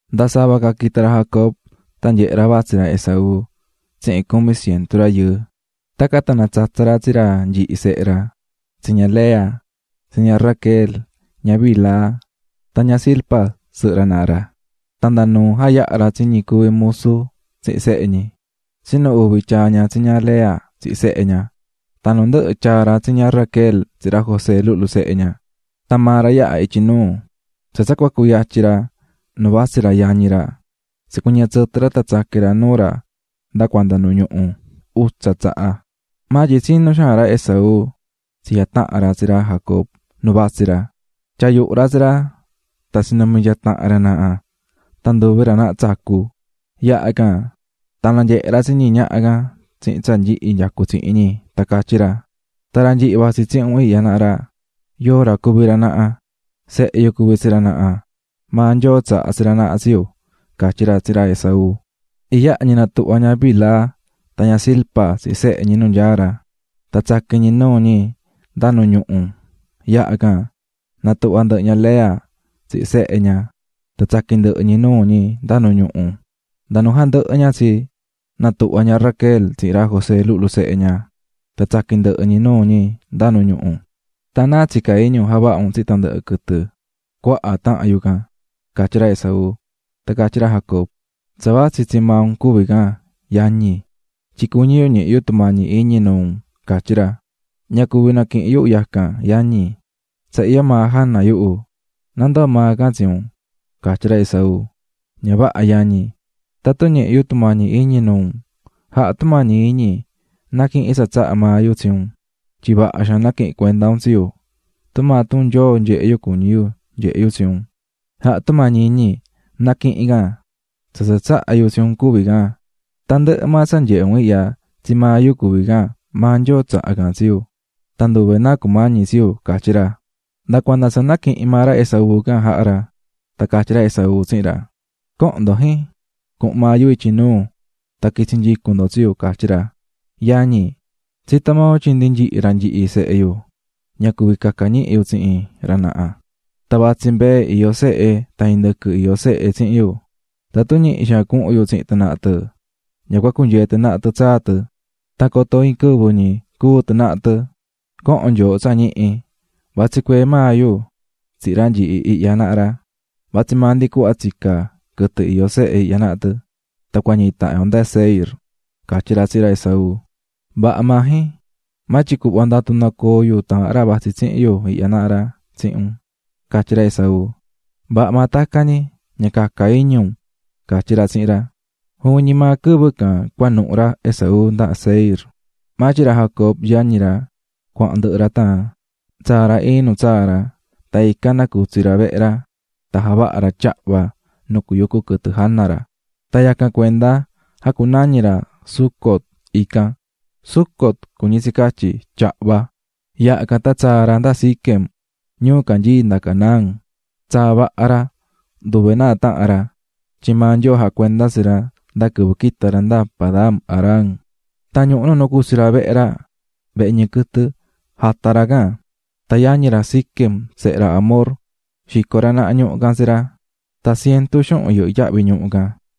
Nda sava ca quita̱ ra Jacob, tan nyehe̱ ra vatsí ra Esaú tsihin cumi cientu rayɨɨ. Tacan tan natsatsa̱ ra tsi ra nyihi sehe ra, tsi ña Lea, tsi ña Raquel, ña Bilha tan ña Zilpa sɨhɨ ra naha ra. Tan nda nuu jayaha̱ ra tsi ñi cuví musu tsihin sehe ñi, tsinu uvi tyaa̱ ra tsi ña Lea tsihin sehe ña, tan nu ndɨhɨ tyaa̱ ra tsi ña Raquel tsihin ra José luhlu sehe ña. Tan maa ra yaha̱ ityi nuu, tsa tsa cua cuyatyin ra nu vatsí ra yañi ra tsicuɨñɨ̱ tsɨtɨ ra tan tsaqui̱n ra nuu ra nda cuanda nu ñuhu, utsa tsaha. Maa tyin tsinú xaan ra Esaú tsi jataha̱n ra tsi ra Jacob nu vatsí ra, tyaa̱ yuhu ra tsi ra tan tsinumi̱ nyaa tahan ra naha tan nduvi ra naha tsacu̱. Yaha can tan nanyehe̱ ra tsi ñi ñaha can tsihin tsa nyihi nyacú tsihin ñi tan catyí ra: --Tan ra nyihi vatsí tsihin un ihya naha ra ¿Yóo ra cuví ra naha? --Sehe yu cuví tsi ra naha, maa Nyoo tsaha̱ tsi ra naha tsi yu ―catyí ra tsihin ra Esaú. Iyaha ñi natuhva̱ ña Bilha tan ña Zilpa tsihin sehe ñi nu nyaá ra, tan tsaqui̱n ñi nuu ñi nda nu ñuhu. Yaha can, natuhva̱ ndɨhɨ ña Lea tsihin sehe ña tan tsaqui̱n ndɨhɨ ñi nuu ñi nda nu ñuhu. Nda nu jandɨhɨ ña tsi, natuhva̱ ña Raquel tsihin ra José luhlu sehe ña, tan tsaqui̱n ndɨhɨ ñi nuu ñi nda nu ñuhu. ―Tan ¿náa tsicá iñi un javaha un tsihin tandɨhɨ quɨtɨ cuaha taha̱n yu can? ―catyí ra Esaú. Tan catyí ra Jacob: --Tsa vatsí, tsii maa un cuví can, yañi, tyin cuñí yu ñihi yu tumañi iñi nuu un --catyí ra. --Ña cuví naquihin yu yacan yañi, tsa iyó maa jana yuhu, na ndoo maa can tsi un ―catyí ra Esaú. --Ña vaha yañi, tatun ñihi̱ yu tumañi iñi nuu un, ja̱ha tumañi iñi, na̱quihin tsa tsahá maa yu tsi un, tyin vaha xaan naquihi̱n cuenda un tsi yu, tumaa tun Nyoo nyehé yu cuñí yu nyehé yu tsi un. Ja̱ha tumañi iñi na̱quihin can, tsa tsa tsaha̱ yu tsi un cuví can, tandɨhɨ maa tsa nyehé un ihya tsii maa yu cuví can maa Nyoo tsaha̱ can tsi yu, tan nduve náa cumañi tsi yu ―catyí ra. Nda cuanda tsa naquihi̱n maa ra Esaú can jaha̱ ra. Tan catyí ra Esaú tsihin ra: --Co̱hon ndo, jin, cuhun maa yu ityi nuu tan quitsi nyicun ndo tsi yu ―catyí ra. --Yañi, tsitó maa un tyin ndi nyihi ra nyihi sehe yu ña cuví caca ñihi yu tsihin ra naha, tan vatsí mbee iyó sehe tan indɨquɨ iyó sehe tsihin yu, tatun ñihi xaan cuhun yu tsihin tɨ naha tɨ ña cua cunyee tɨ tsaa tɨ, tan coto iin quɨvɨ ñi cúu tandɨhɨ tɨ naha tɨ. Co̱hon nyooho tsa ñihi, vatsi cuee maa yu tsihin ra nyihi ihya naha ra, vatsi maa ndi cuhva tsicá quɨtɨ iyó sehe ihya naha tɨ, tan cua ñihi tahan yo nda Seir ―catyí ra tsihin ra Esaú. --Vaha maa, jin. Maa tyin cu̱hva ndatu nacoo yu taahan ra vatsi tsihin yu ihya naha ra tsihin un ―catyí ra Esaú. ―Vaha maa tacan ñi, ña caca iñi un --catyí ra tsihin ra. Juvin ñi maa quɨvɨ can cuanuhu̱ ra Esaú nda Seir. Maa tyin ra Jacob, yañi ra, cuahan ndɨhɨ ra tan tsaa̱ ra iin nu tsaa̱ ra, tan ican nacutsi̱ ra vehe ra tan javaha̱ ra tyahva nu cuyucu quɨtɨ jana ra. Tan yacan cuenda jacunañi̱ ra Sucot ican. (Sucot cuñí tsi catyí "tyahva"). Yaha can tan tsaa̱ ra nda Siquem, ñuu canyií nda Canaán, tsaa̱ vaha ra, nduve náa tahan ra, tyin maa Nyoo jacuendá tsi ra nda quɨvɨ quita̱ ra nda Padan-aram. Tan ñuhu nu nacutsi̱ ra vehe ra (vehe ñɨɨ quɨtɨ), jata̱ ra can, tan yañi ra Siquem, sehe ra Hamor, xico̱ ra naha ñuhu can tsi ra, tan cientu xuhun yɨhɨ́ yahvi ñuhu can.